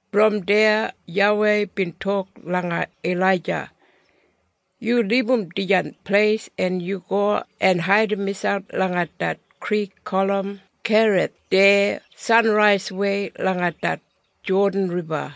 Brom deya YAWEI bin tok langa Ilaija, “Yu libum dijan pleis en yu go en haidim miselp langa det krik gulum Kerith deya sanraiswei langa det Jodan Riba.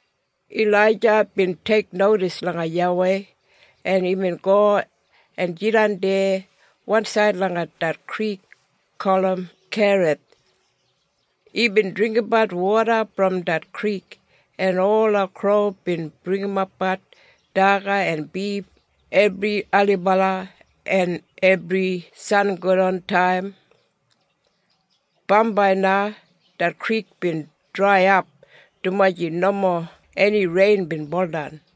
Ilaija bin teiknodis langa YAWEI, en imbin go en jidan deya wansaid langa det krik gulum Kerith. Imbin dringgimbat woda brom det krik, en ola kro bin bringimapbat daga en bif ebri ailibala en ebri sangodantaim. Bambai na det krik bin draiyap dumaji nomo eni rein bin buldan.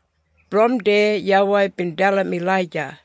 Brom deya YAWEI bin dalim Ilaija,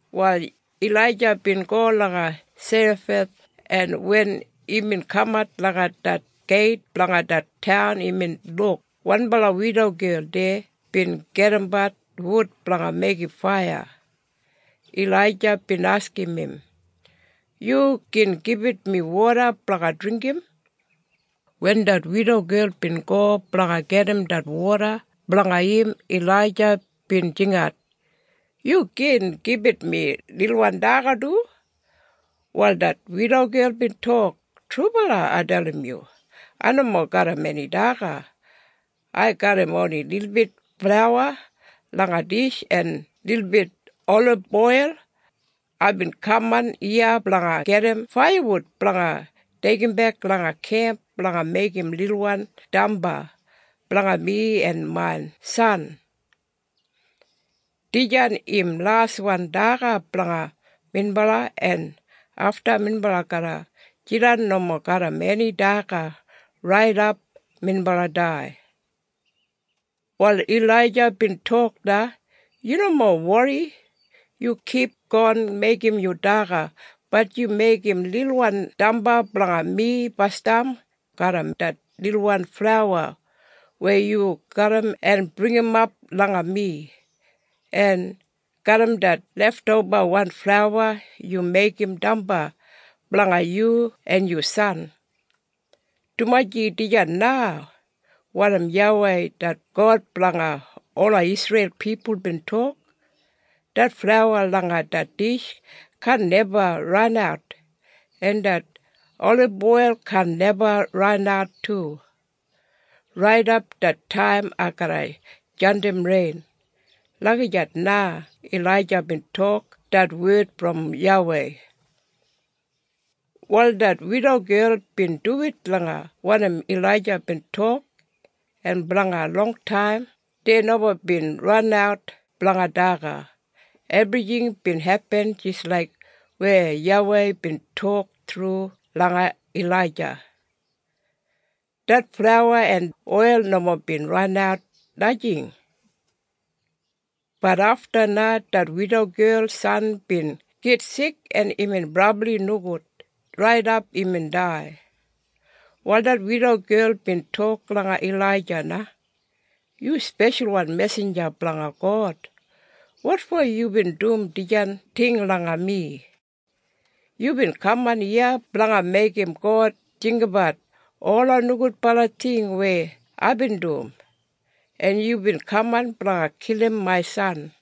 Wal Ilaija bin go langa Serafath en wen imbin kamat langa det geit blanga det taun imbin luk wanbala widogel deya bin gedimbat wud blanga meigim faiya. Ilaija bin askim im, “Yu gin gibit mi woda blanga dringgim?” Wen det widogel bin go blanga gedim det woda blanga im Ilaija bin jingat, “Yu gin gibit mi lilbit daga du?” Wal det widogel bin tok, “Trubala ai dalim yu. Ai nomo garram eni daga. Ai garram oni lilbit flauwa langa dish en lilbit oliboil. Aibin kaman iya blanga gedim faiyawud blanga deigimbek langa kemp blanga meigim lilwan damba blanga mi en main san. Dijan im laswan daga blanga minbala en afta minbala garra jidan nomo garram eni daga raidap minbala dai.” Wal Ilaija bin tok na, “Yu nomo wori. Yu kipgon meigim yu daga. Bat yu meigim lilwan damba blanga mi basdam garram det lilwan flauwa weya yu garram en bringimap langa mi, en garram det leftobawan flauwa yu meigim damba blanga yu en yu san. Dumaji dijan na wanim YAWEI det God blanga ola Isreil pipul bin tok, ‘Det flauwa langa det dish kaan neba ranat, en det oliboil kaan neba ranat du, raidap det taim ai garra jandim rein.’” Lagijat na Ilaija bin tok det wed brom YAWEI. Wal det widogel bin duwit langa wanim Ilaija bin tok en blanga longtaim dei nomo bin ranat blanga daga. Ebrijing bin hepin jis laik weya YAWEI bin tok thru langa Ilaija. Det flauwa en oil nomo bin ranat, najing. Bat afta na, det widogel san bin gitsik en imbin brabli nogud, raidap imbin dai. Wal det widogel bin tok langa Ilaija na, “Yu speshalwan mesinja blanga God. Wotfo yubin dum dijan ting langa mi? Yubin kaman iya blanga meigim God jinggabat ola nogudbala ting weya aibin dum, en yubin kaman blanga kilim main san?”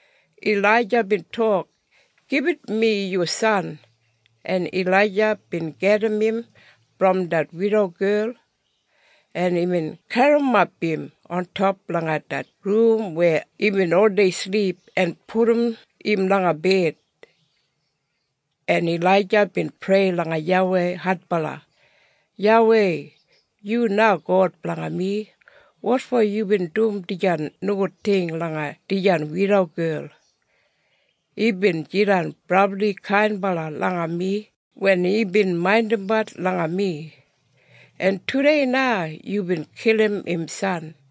Ilaija bin tok, “Gibit mi yu san.” En Ilaija bin gedim im brom det widogel, en imbin garrimap im ontop langa det rum weya imbin oldei silip en pudum im langa bed. En Ilaija bin prei langa YAWEI adbala, “YAWEI yu na God blanga mi. Wotfo yubin dum dijan nogud ting langa dijan widogel? Imbin jidan brabli kainbala langa mi wen imbin maindimbat langa mi, en tudei na yubin kilim im san.”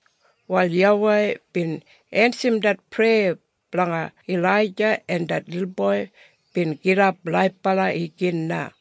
Wal YAWEI bin ensim det preya blanga Ilaija en det lilboi bin gidap laibala igin na.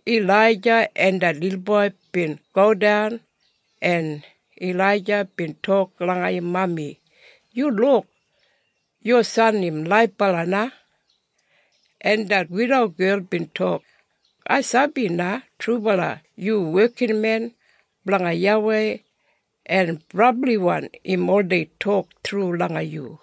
Ilaija en det lilboi bin godan en Ilaija bin tok langa im mami, “Yu luk! Yu san im laibala na.” En det widogel bin tok, “Ai sabi na trubala yu wekinmen blanga YAWEI en brabliwan im oldei tok thru langa yu.”